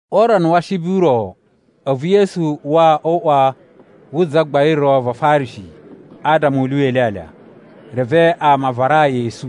O urana wa Ashibi u ro, a̱vu Yesu uwa o uꞌwa wu zagbain ro va Afarishi adama u lyuwa ilyalya. Reve ama a varaa yi esu,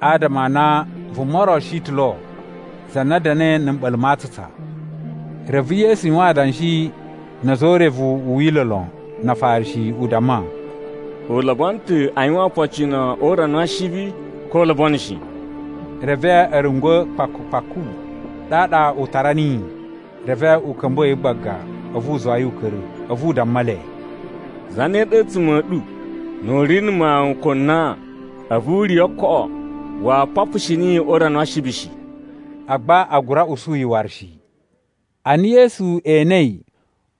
adama a na vuma ro shi ta̱ lo za na da̱na̱i na̱ mɓa̱la̱ ma atsutsa. Reve Yesu yuwan adanshi na̱ a̱za̱ o urevu u Wila̱ lon na Afarishi, u damma, “U lobono ta̱ a yuwan opocino o urana wa Ashibi, ko u lobono shi?” Reve a̱ rungwa̱ kpaku-kpaku. Ɗaɗa u tara niyi, reve u ka̱mbuwa̱ yi gbaga, a̱vu u zuwa yi u ka̱ra̱. A̱vu u damma le, “Zane ɗa a̱tsuma̱ a̱ ɗu nu u ri na̱ mawun ko nan, a̱vu u riya̱ o ookoꞌo, waa papushi niyi o urana wa Ashibi shi?” Agba a gura usu yi waru shi. Ana Yesu enei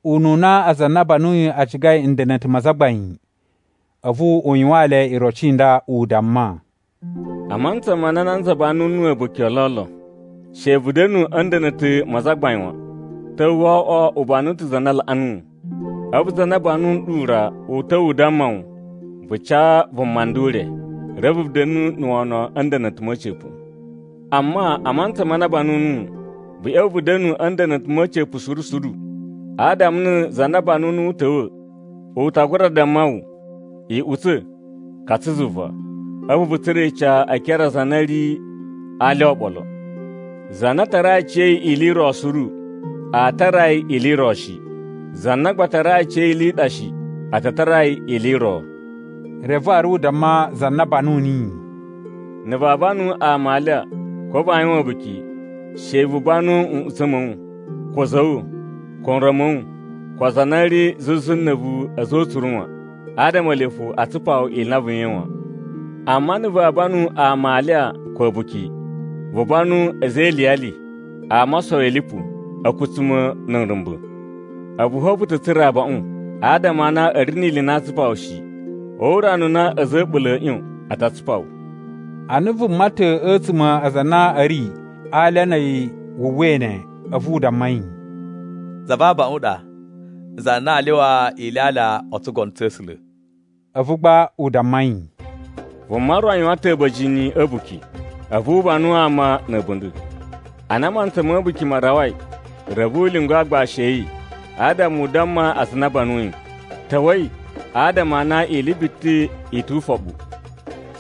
ununa aza a na a banuyi a cigai nda̱na̱ta̱ ma azagbain, a̱vu u yuwaan le iroci i nda, u damma, “A mantsa ma na nanza banu nuwu a̱buki o lolo, she vu da̱nu a̱ nda̱na̱ta̱ ma azagbain wan. Ta̱wa̱ wo oꞌwo u banu ta̱ za na laꞌa nuwu, a̱vu za na banu nɗu ra u ta̱wa̱ u damma wu, ‘Vu ca vuma nda ure.’ Reve vu da̱nu na̱ wono a̱ nda̱na̱ta̱ ma̱ a̱ca̱pa̱. “Amma a mantsa ma na a banu nuwu, vu ꞌya̱wa̱ vu da̱nu a̱ nda̱na̱ta̱ ma̱ a̱ca̱pa̱ suru suru. Adama na̱ za na banu nuwu u ta̱wa̱, u ta gura damma wu, ‘Iꞌutsa̱, katsa zuva.’ A̱vu vu tsura̱ ica e ekere a aza a na i ri alya oɓolo. Za na tarai aciya̱yi ili i ro suru, aa tara yi ili i ro shi. Za na gba tarai aciya̱yi ili shi, a ta tara yi ili i ro.” Reve waru u damma za na banu niyi, “Na̱ vaa banu ama alya ko vaa yuwan a̱buki, she vu banu nꞌutsa̱ ma̱ wu, ko a̱za̱ a̱ wu, ko nron ma̱ wu, ko aza a na a̱ ri zuzu na̱ a̱vu a̱za̱ o utsuru wan. Adama ele fo a tsupa wu ili i na vu yuwain wan. Amma na̱ vaa banu ama alya ko a̱buki, vu banu a̱za̱ e iliyali, ama o osowi lipu, a̱kutsuma̱, na̱ nrumba̱. A̱vu fo vu ta̱ tsura̱ abaꞌun; adama a na a̱ ri ni ili i na aa tsupaa wu shi. O urana u na a̱za̱ a̱ a̱ɓula̱ a̱a̱ ꞌyon, a ta tsupa wu.” Ana vuma ta̱ a̱tsuma̱ a aza a na a̱ ri a alya na̱ a̱yi wu uwwai ne, a̱vu u damma yi, “Za va abaꞌun a ɗa za na aa lyuwa ilyalya o tsugono tsa̱ A̱sula̱.” A̱vu gba u damma yi, “Vuma ro yuwan ta̱ a̱ba̱jini a̱ a̱buki. A̱vu u banu ama na̱ a̱bunda̱. Ana mantsa ma̱ a̱buki ma rawai, reve u lyungu aagbashi a̱ yi adama u damma aza a na a banuyi, ‘Ta̱wa̱i adama a na ili biti i tu ufoɓu!’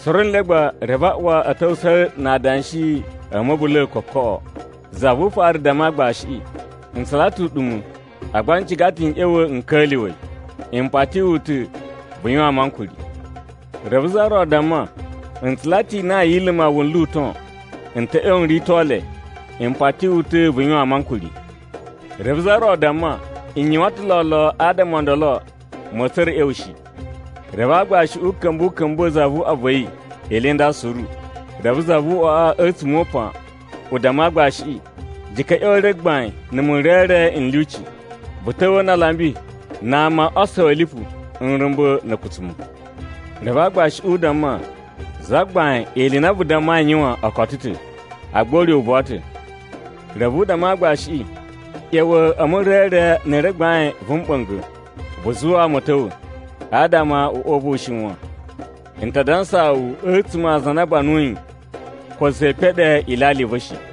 “Suru nle gba, reve a uwa a̱ ta̱wusa̱a̱ na adanshi a̱ ma̱bula̱a̱ kokoꞌo. Za vu ufaru damma aagbashiꞌi, ‘N tsula ta̱ uɗuma̱, agba n ciga ta̱ n ꞌya̱wa̱ n ka̱lyuwa̱ yi. M pati wu ta̱, vu yuwaan mu ankuri.’ “Reve za ro damma, ‘N tsula ta̱ inan yi iluma wunlu u ton. N ta̱ ꞌya̱wa̱ n rito le. M pati wu ta̱ vu yuwaan mu ankuri.’ “Reve za ro damma, ‘N yuwan ta̱ lolo adama o ndolo ma̱a̱ tsura̱ a̱ ꞌya̱wa̱ shi.’ “Reve aagbashiꞌi u ka̱mba̱ u ka̱mbuwa̱ zavuꞌwa va̱ yi ili i nda suru. Reve zavuꞌwaꞌa a̱tsuma̱ o upan, u damma aagbashiꞌi, ‘Jika̱ ꞌya̱wa̱ e re gbain na̱ murere n lyuci, vu ta̱wa̱a̱ na alambi, na ama o osowi a̱ lipu, nrumba̱, na̱ a̱kutsuma̱.’ “Reve aagbashiꞌi u damma, ‘Zagbain, ili i na vu dammai a yuwan o koto ta̱, agba ure u buwa ta̱.’ “Reve u damma aagbashiꞌi, ‘ꞌYa̱wa̱ e murere na̱ re gbain vu mɓa̱nga̱, vu zuwa ama a̱ ta̱wa̱, adama uꞌwa u va̱ u shiwan. N ta dansaa wu a̱tsuma̱ aza a na a banuyi ko za ee peɗe ilyalya i va̱ shi.’”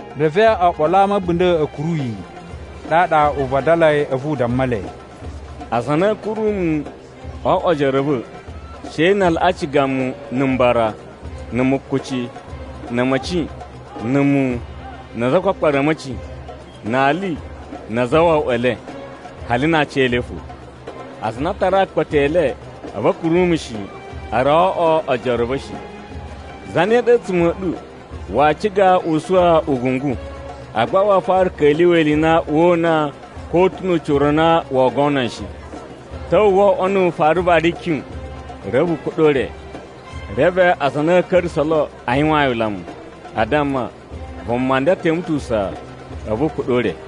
Reve oɓolo a ama a̱ a̱bunda̱ a̱ kuru yi, ɗaɗa u vadalai a̱vu u damma le, “Aza a na a̱a̱ kuru mu o oꞌwo ojoro a̱ va̱, she na a laꞌa ciga mu na̱ mbara, na̱ mukuci, na̱ a̱ma̱ci, na̱ muwun, na azakpakpara a̱ a̱ma̱ci, na ali na azawawaꞌa e le, hali na aciyele fo. Aza a na a tarai akpata e le, a̱vu a̱ kuru mu shi, a rawa o oꞌwo ojoro a̱ va̱ shi. “Zane ɗa a̱tsuma̱ a̱ ɗu waa ciga u suwa ugungu, agba waa fara ka̱lyuwa̱ ili i na woo una, ko u ta̱ nu ucira u na woo gono yi shi? Ta̱wa̱ wo oꞌwo nu u fara vara ikyun, reve u kuɗa̱ o ure. Reve aza a na a̱ ka̱ra̱sa̱ lo a yuwaan yi ulamu. A damma, ‘Vuma nda teme ta̱ usaa, a̱vu u kuɗa̱ o ure.’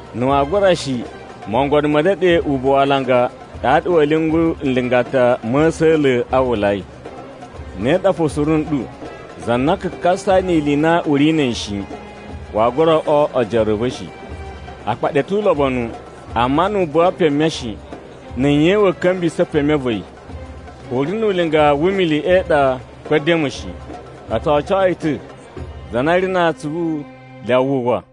Na̱ waa gura shi, mogono ma̱ ndeɗe ubuwu alanga ɗaɗa wa̱a̱ lyungu nlingata ma̱ a̱sa̱la̱ a uwwulayi. Ne ɗa fo suru nɗu, za na kakasai ni ili i na u ri na̱ a̱yi shi, waa gura oꞌwo ojoro a̱ va̱ shi. “Akpaɗi a̱ tu ulobonu, amma na a buwa peme shi, na̱ nye wa̱a̱ ka̱mbuwisa̱ peme va̱ yi? U ri nu ulinga wu umili e iɗa, ko e edemu shi. O tso oco yi ta̱. “Za na ri na atsuvu, lyawa wu uwwa.”